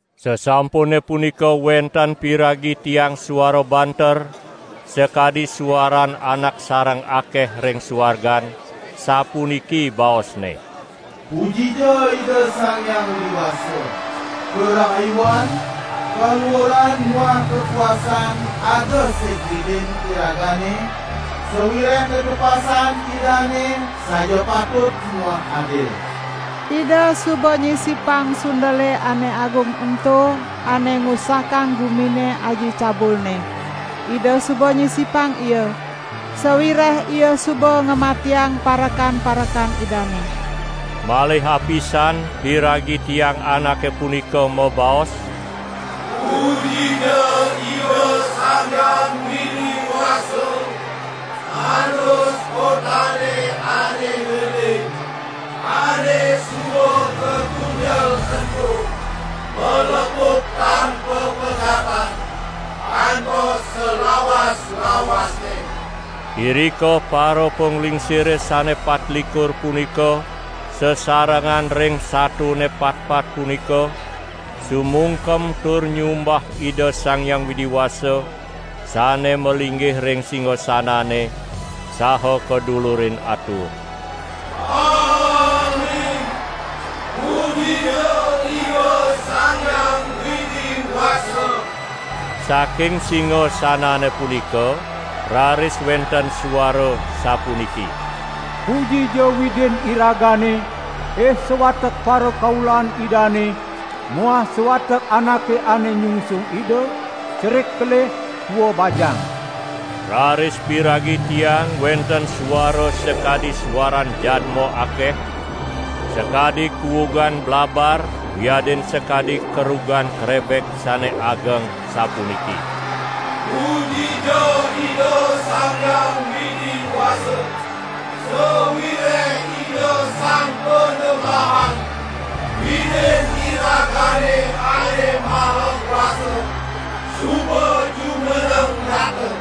Sasampune punika wenten piragi tiang suara banter, sakadi suaran anak sareng akeh ring suargan, sapuniki baosne: "Pujija Ida Sang Hyang Widi Wasa! Karahayuan, kaluuran muah kakuasan ada sig Widin iragane, sawireh tetepasan Idane saja patut muah adil. Ida suba nyisipang sundele ane agung ento ane ngusakang gumine aji cabulne. Ida suba nyisipang ia, sawireh ia suba ngamatiang parekan-parekan Idane." Malih apisan piragi tiang anake punika mabaos: "Pujija Ida Sang Hyang Widi Wasa! Andus kotane ane gede ane suba katunjel ento malepuk tan papegatan kantos salawas-lawasne!" Irika parapanglingsire sane patlikur punika sasarengan ring satone patpat punika sumungkem tur nyumbah Ida Sang Hyang Widi Wasa sane malinggih ring singasanane, saha kadulurin atur: "Amin, pujija Ida Sang Hyang Widi Wasa!" Saking singasanane punika raris wenten suara sapuniki: "Pujija Widin iragane, ih sawatek parakaulan Idane muah sawatek anake ane nyungsung Ida, cerik kelih, tua bajang!" Raris piragi tiang wenten suara sakadi suaran jadma akeh, sakadi kuugan blabar wiadin sakadi kerugan krebek sane ageng sapuniki: "Pujija Ida Sang Hyang Widi Wasa. Sawireh Ida Sang Panembahan, Widin iragane Ane Maha Kuasa, suba jumeneng Nata!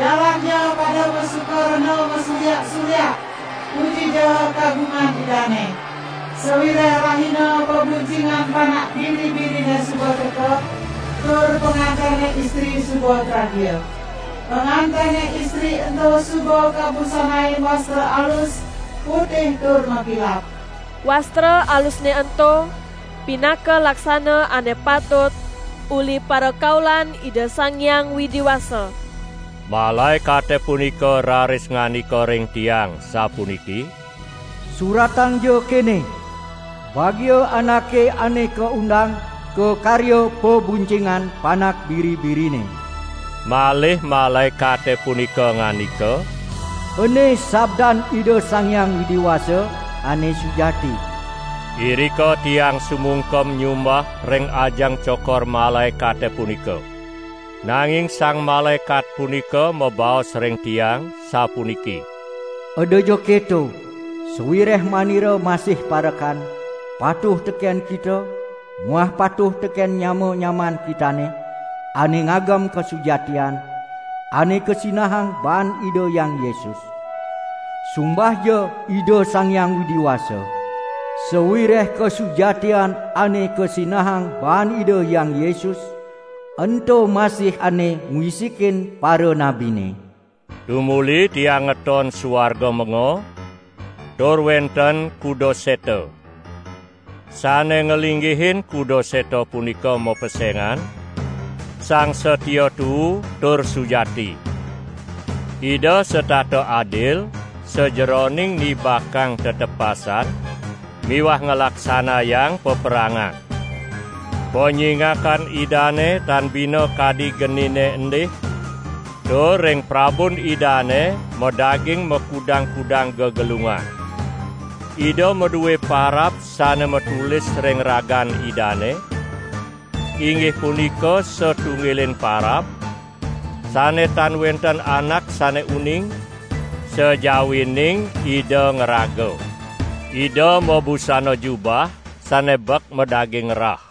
Jalanja pada masuka rena masuryak-suryak! Pujija kagungan Idane! Sawireh rahina pabuncingan Panak Biri-birine suba teka, tur pangantene istri suba tragia. Pangantene istri ento suba kabusanain wastra alus, putih tur makilap!" (Wastra alusne ento, pinaka laksana ane patut uli parakaulan Ida Sang Hyang Widi Wasa.) Malaekate punika raris ngandika ring tiang sapuniki: "Suratangja kene: 'Bagia anake ane kaundang ka karya pabuncingan Panak Biri-birine.' " Malih malaekate punika ngandika: "Ene sabdan Ida Sang Hyang Widi Wasa ane sujati." Irika tiang sumungkem nyumbah ring ajeng cokor malaekate punika. Nanging sang malaekat punika mabaos ring tiang sapuniki: "Edaja keto! Sawireh manira masih parekan, patuh teken kita muah patuh teken nyama-nyamaan kitane ane ngagem kasujatian ane kasinahang baan Ida Hyang Yesus. Sumbahja Ida Sang Hyang Widi Wasa. Sawireh kasujatian ane kasinahang baan Ida Hyang Yesus, ento masih ane ngwisikin paranabine!" Tumuli tiang ngeton suarga menga, tur wenten kuda seta. Sane nglinggihin kuda seta punika mapesengan: "Sang Satia Tuu tur Sujati". Ida setata adil sajeroning nibakang tetepasan miwah nglaksanayang paperangan. Panyingakan Idane tan bina kadi genine endih tur ring prabun Idane madaging makudang-kudang gegelungan. Ida madue parab sane matulis ring ragan Idane, inggih punika satunggiling parab, sane tan wenten anak sane uning, sajawining Ida ngraga. Ida mabusana jubah, sane bek madaging rah.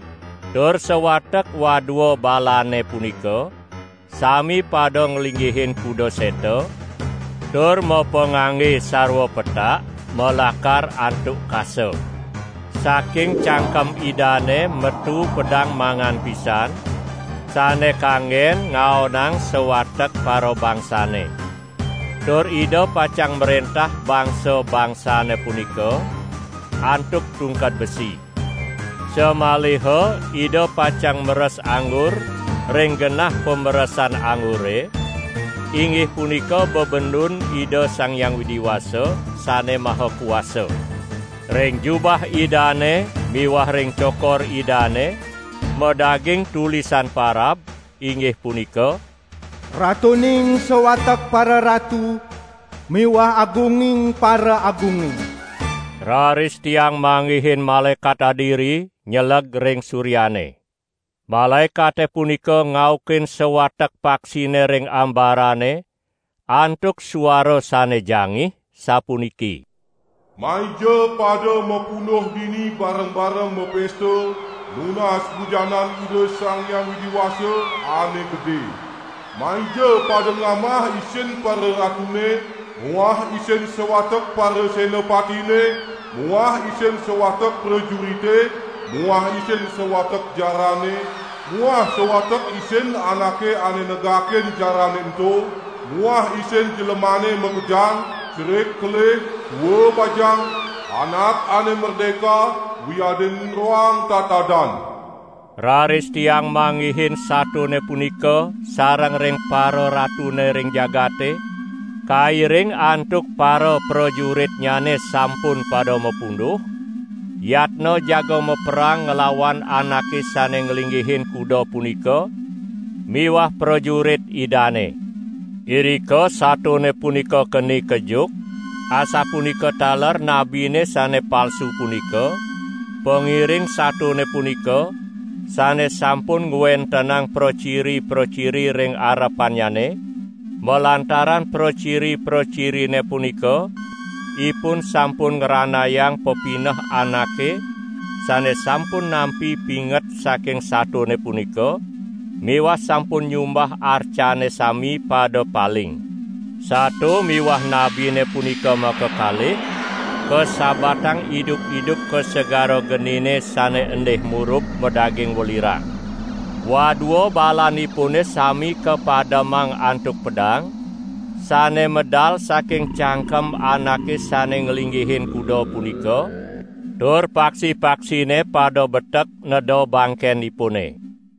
Tur sawatek wadua balane punika sami pada nglinggihin kuda seta tur mapangangge sarwa petak malakar antuk kasa. Saking cangkem Idane metu pedang mangan pisan sane kanggen ngaonang sawatek parabangsane. Tur Ida pacang mrentah bangsa-bangsane punika antuk tungked besi. Samaliha Ida pacang meres anggur ring genah pameresan anggure, inggih punika bebendun Ida Sang Hyang Widi Wasa Sane Maha Kuasa. Ring jubah Idane miwah ring cokor Idane, madaging tulisan parab, inggih punika: "Ratuning sawatek pararatu, miwah Agunging paraagunge". Raris tiang manggihin malaekat adiri nyeleg ring suryane. Malaekate punika ngaukin sawatek paksine ring ambarane antuk suara sane jangih sapuniki: "Maija pada mapunduh dini bareng-bareng mapesta, nunas bujanan Ida Sang Hyang Widi Wasa, ane gede! Maija pada ngamah isin pararatune muah isin sawatek parasenapatine muah isin sawatek prajurite muah isin sawatek jarane muah sawatek isin anake ane negakin jarane ento muah isin jlemane makejang, cerik kelih, tua bajang, anak ane merdeka wiadin roang tatadan!" Raris tiang manggihin satone punika sareng ring pararatune ring jagate, kairing antuk paraprajuritnyane sampun pada mapunduh, yatna jaga maperang nglawan Anake sane nglinggihin kuda punika miwah prajurit Idane. Irika satone punika keni kejuk, asapunika taler nabine sane palsu punika, pangiring satone punika, sane sampun ngwentenang praciri-praciri ring arepannyane, (malantaran praciri-pracirine punika ipun sampun ngranayang pepineh anake sane sampun nampi pinget saking satone punika miwah sampun nyumbah arcannyane sami pada paling). Sato miwah nabine punika makakalih kasabatang idup-idup ka segara genine sane endih murub madaging welirang. Wadua balanipune sami kapademang antuk pedang, sane medal saking cangkem Anake sane nglinggihin kuda punika; tur pada paksi-paksine betek neda bangkenipune.